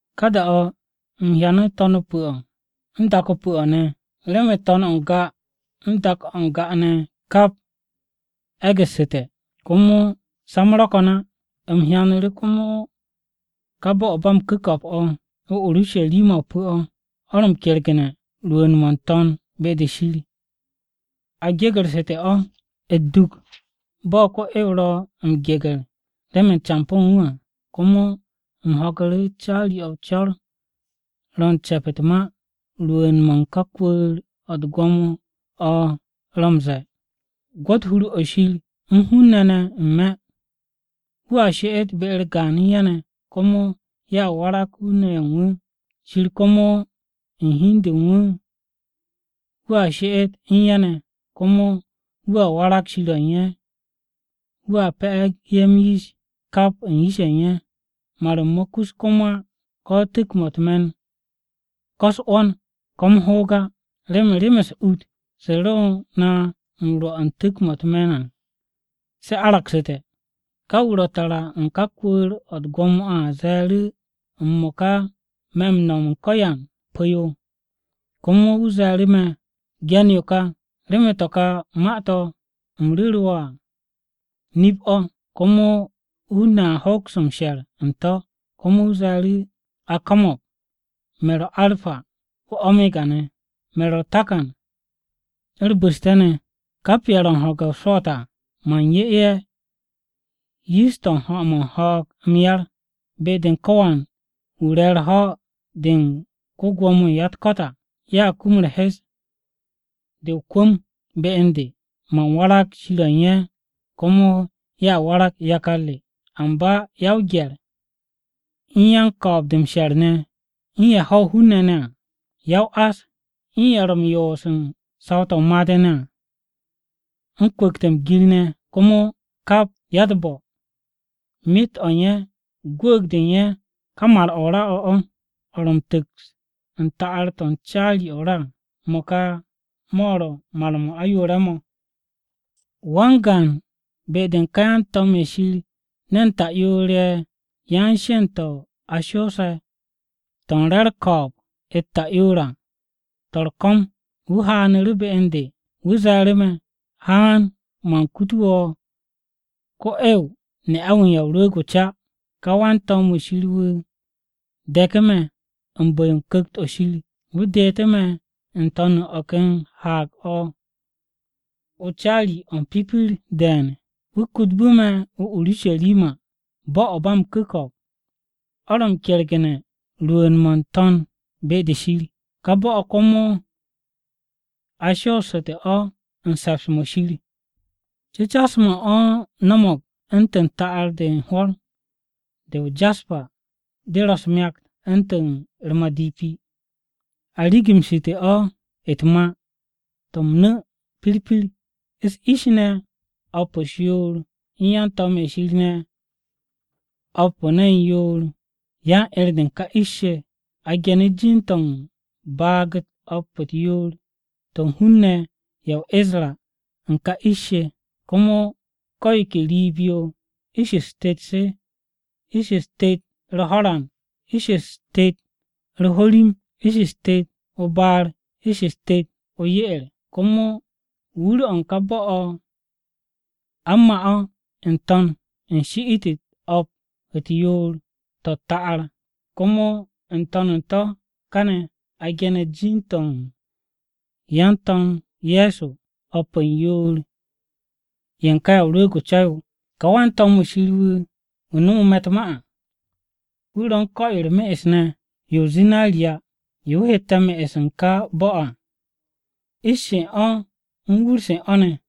Ka da-o̱ u̱m hyanu̱ To̱n-o pu̱-o̱ u̱n dak-o pu̱-o̱ ne̱. Remen To̱n-o̱ n-ga u̱n dak-o̱ n-ga ne̱ kap e̱gu̱ssu̱te̱, komo sa-m ro̱ ko̱n á. U̱m hyanu̱ru̱ komo ka bo̱-o̱ ba m-ku̱ko̱p o̱, Urusharima-o pu̱-o̱, o̱ ro̱ m-kergu̱ne̱ rwu̱u̱n-mo̱ n-To̱n be-de Shir. A gegu̱rsu̱te̱ o̱ u̱t-duk bo̱ ko-'ew ro̱ m-geger remen campo̱ u̱n wu̱ à. Komo u̱m ho̱gu̱ru̱ caari-o̱ co̱r-o̱ ro̱ u̱n ce̱p u̱t-ma rwu̱u̱n-mo̱ u̱n kwu̱u̱r-o̱ u̱t-gwo̱mo o̱ ro̱ m-ze̱e̱, “Gwo̱t hur-o̱ Shir u̱n hun-ne̱ ne̱ n-me̱! Wu̱a she'et be-u̱r gaan u̱n ye̱ ne̱. Komo ye̱ warag hun-ne̱ ye̱ u̱n wu̱. Shir komo u̱n hi u̱n de u̱n wu̱ wu̱a she'et u̱n ye̱ ne̱, komo wu̱ warag Shir-o̱ u̱n ye̱. Wu̱a pe̱'e̱gu̱ ye̱ m-yish kap u̱n yish-ye̱ u̱n ye̱. Mar-m mo̱ kus komo á, ko̱ tu̱k-mo̱ u̱t-me̱n, ko̱ u̱s-'wo̱n, ko̱ m-hoog á, remen rem-u̱s ut se ro na m-rwo̱ u̱n tu̱k-mo̱ u̱t-me̱n à, se aragsu̱te̱.” Ka wu̱ ro tara u̱n ká kwu̱u̱r-o̱ u̱t-gwo̱mo à ze̱e̱ru̱, “M-mo̱ka me̱ m-no̱m u̱n ko̱yan pu̱-yo!” Komo wu̱ ze̱e̱ru̱ me̱, “Ge̱n yo ka, remen to̱ ka ma-to̱ u̱m ru̱ru̱ wo̱ à nip-o̱, komo hun-ne̱ a hoks m-she̱r u̱n to̱.” Komo wu̱ ze̱e̱ru̱, “A ko̱mo̱g! Me̱ ro̱ Arpa, u̱n Omega ne̱. Me̱ ro̱ u̱r-Takan u̱r-Bu̱ste̱ ne̱. Kap ye̱ ro̱ u̱n ho̱ge̱ o-swo̱o̱t à, man 'ye ye̱ yish-to̱ ho̱-mo̱ u̱n ho̱o̱g m-yar. Be-de u̱n ko̱wan wu̱ re̱ u̱r-ho̱ de u̱n ko-Gwo̱mo-wu̱ u̱n ya-u̱t-ko̱t à, ye̱a kum u̱r-hes de o-kwu̱m be u̱n de. Man warag Shir o̱ u̱n ye̱, komo ye̱a warag yakar re. Amba ya-o-gye̱r, u̱n yan-ko̱o̱b-de m-she̱r ne̱, u̱n ye̱ ho̱ hun-ne̱ à, ya-o-ás, u̱n ye̱ ro̱ m-yoos u̱n saw-to̱ made ne̱ à, u̱n kwu̱kte̱ m-gir ne̱ komo kap ya-u̱t-bo̱, myet-o̱ u̱n ye̱ gwu̱u̱g-de u̱n ye̱ ka mar-mo̱ o-ra o̱, o̱ ro̱ m-tu̱ks u̱n ta'ar-to̱ u̱n caari-o̱ o-ra à. Mo̱ ka ro̱ mar-m ayoore̱-mo̱.” Wan-gaan be-de u̱n ka yan-to̱m-ye̱ Shir ne̱n ta'yoor-ye̱ yan-sheend-to̱ a shoose̱ to̱ u̱n re u̱r-ko̱o̱b u̱t-ta'yoor à, to̱ u̱r-ko̱m wu̱ haanu̱ru̱ be u̱n de. Wu̱ ze̱e̱ru̱ me̱, “Haan, man kutu wo̱ ko-'ew, ne'a-wu̱ u̱n Ya o-Rwu̱u̱g o-Ca.” Ka wan-to̱m-wu̱ Shir wu̱ de̱ku̱ me̱ u̱n bu̱-yo Ku̱kt-o Shir wu̱ deetu̱ me̱ n-to̱n u̱n o̱ ken haag-o caari-o̱ o̱ m-pipir de̱e̱n. Wu̱ kutbu̱ me̱ o-Urusharima, bo̱-o̱ ba m-ku̱ko̱p o̱ ro̱ m-kergu̱ne̱ rwu̱u̱n-mo̱ n-To̱n be-de Shir. Ka bo̱-o̱ komo a shoostu̱ o̱ u̱n se̱ps-mo̱ Shir m-cu̱cas ne̱ cu̱cas-mo̱ u̱n o̱ no̱mo̱g u̱ntu̱n ta'ar-de u̱n hwo̱r, o-jaspa de ro̱ u̱s-myakt u̱ntu̱n u̱r-madipi. A rigimshite̱ o̱ u̱t-ma to̱ m-nu̱ pirpir, u̱s-ish ne̱ o̱p u̱s-yoor, u̱n yan-to̱m-ye̱ Shir ne̱ o̱p u̱n ne̱n yoor yan-'er-de u̱n ka ish-se. A genu̱ jin-to̱ u̱n baag-u̱t o̱p-u̱t yoor-to̱ u̱n hun-ne̱ ye̱ o-Isra u̱n ka ish-se. Komo ko̱ yo ke riib-yo ish-u̱s tet-se, ish-u̱s tet u̱r-ho̱ran, ish-u̱s tet u̱r-ho̱rim, ish-u̱s tet o-baar, ish-u̱s tet o-ye'er. Komo wur-o̱ u̱n ka bo̱-o̱ a u̱n ma o̱ n-to̱n u̱n shi'it-u̱t o̱p u̱n yoor-to̱ u̱t-ta'ar. Komo n-to̱n u̱n to̱ kane̱ a gene̱ jin-to̱ u̱n yan-To̱m Ye̱so o̱p u̱n yoor-ye̱ u̱n ka Ya o-Rwu̱u̱g o-Ca yo. Ka wan-to̱m-wu̱ Shir wu̱ nome̱ u̱t-ma u̱n me̱ ne̱ à, wu̱ ro̱ u̱n ko̱-yo u̱r-me'es ne̱ yo o-zinariya yo wu̱ hette̱ me'es u̱n ka bo̱-o̱ à, ish-se u̱n o̱, u̱n wur-se u̱n o̱ ne̱.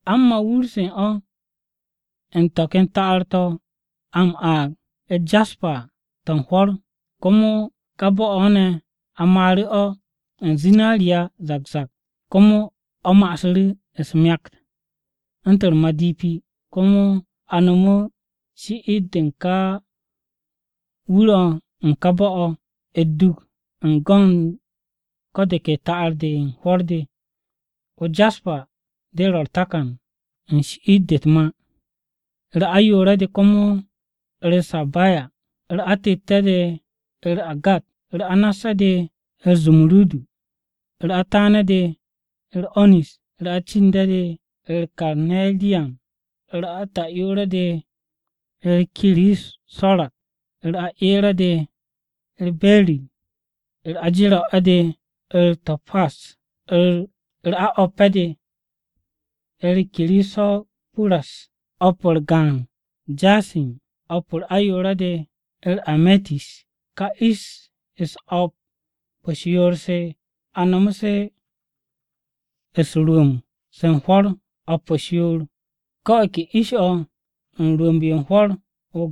A u̱n ma wur-se u̱n o̱ u̱n to̱ ken ta'ar-to̱ a m-aag u̱t-jaspa à to̱ u̱n hwo̱r. Komo ka bo̱-o̱ ne̱ a maaru̱ o̱ u̱n zinariya zak zak, komo o̱ ma'asu̱ u̱s-myakt u̱ntu̱n u̱r-madipi. Komo a nomo shi'it-de u̱n ka wur-o u̱n ka bo̱-o̱ u̱t-duk u̱n go̱n ko̱ de ke ta'ar-de u̱n hwo̱r de. O-jaspa de ro̱ u̱r-takan u̱n shi'it-de u̱t-ma. U̱r-ayoore̱-de komo u̱r-sappaya, u̱r-atette̱-de u̱r-agat, u̱r-anasse̱-de u̱r-zumurudu, u̱r-ataane̱-de u̱r-onis, u̱r-acinde̱-de u̱r-karneriyan, u̱r-ata'yoore̱-de u̱r-kiriso̱rat, u̱r-aeere̱-de u̱r-berir, u̱r-ajero̱ne̱-de u̱r-to̱pas, u̱r-ao̱pe̱-de u̱r-kirisopuras, o̱p-u̱r gaan jasin, o̱p ayoore̱-de u̱r-ametis. Ka ish-u̱s o̱p u̱s-yoor se a nom se u̱n rwu̱u̱mb-se u̱n hwo̱r o̱p u̱s-yoor, ko̱ o̱ ke ish-o̱ u̱n rwu̱u̱mb-o̱ u̱n hwo̱r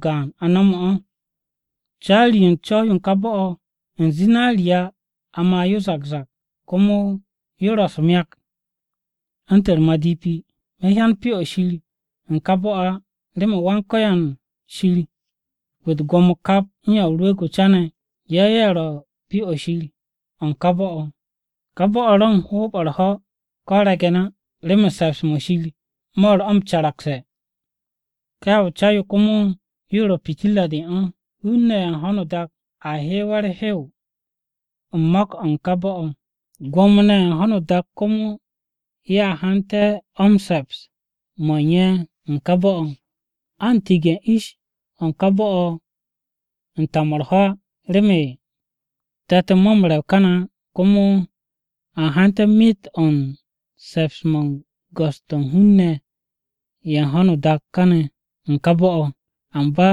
gaan a no̱mu̱ o̱. Caari-yo u̱n co̱w-yo u̱n ka bo̱-o̱, u̱n zinariya a ma yo zak zak, komo yo ro̱ u̱s-myakt u̱ntu̱n u̱r-madipi. Me̱ hyan Pyo-o̱ Shir u̱n ka bo̱-o̱ á, remen Wan-Ko̱yan Shir Wa-u̱t-Gwo̱mo kap u̱n Ya o-Rwu̱u̱g o-Ca ne̱ ye̱ ye̱ ro̱ Pyo-o̱ Shir o̱ u̱n ka bo̱-o̱. Ka bo̱-o̱ ro̱ u̱n hoob-o̱ u̱r-ho̱ ko̱ o-re̱ng á, remen se̱ps-mo̱ Shir mo̱ ro̱ o̱ m-caragse̱, ka Ya o-Rwu̱u̱g o-Ca yo komo yo ro̱ pitirra-de u̱n o̱. Hun-ne̱ ye̱ u̱n ho̱no o-dak a hewe̱ u̱r-hew m-mo̱k o̱ u̱n ka bo̱-o̱. Gwo̱mo-ne̱ ye̱ u̱n ho̱no o-dak komo ye̱a hante̱ o̱ se̱ps-mo̱ u̱n ye̱ n-me̱ u̱n ka bo̱-o̱. An tige̱ u̱n ish-se u̱n ka bo̱-o̱ u̱n ta-mo̱ u̱r-ho̱ á remen te̱t-mo̱ m-rew kane̱ á. Komo a hante̱ myet o̱ u̱n m-se̱ps u̱n go̱s-to̱ u̱n hun-ne̱ ye̱ u̱n ho̱no o-dak ne̱ u̱n ka bo̱-o̱. Amba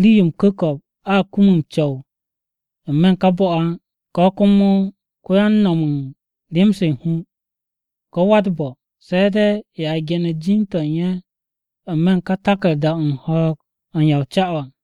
rii-yo m-ku̱ko̱p a kum m-co̱w n-me̱ u̱n ka bo̱-o̱ á, ko̱ komo ko̱yan no̱m u̱n rem-se u̱n hu, ko̱ wa-u̱t-bo̱, se̱ de̱ ye̱ a ge̱ne̱ jin-to̱ u̱n ye̱ n-me̱ u̱n ka taku̱rda-o̱ u̱n ho̱o̱g-o̱ u̱n ka Ya o-Rwu̱u̱g o-Ca yo à.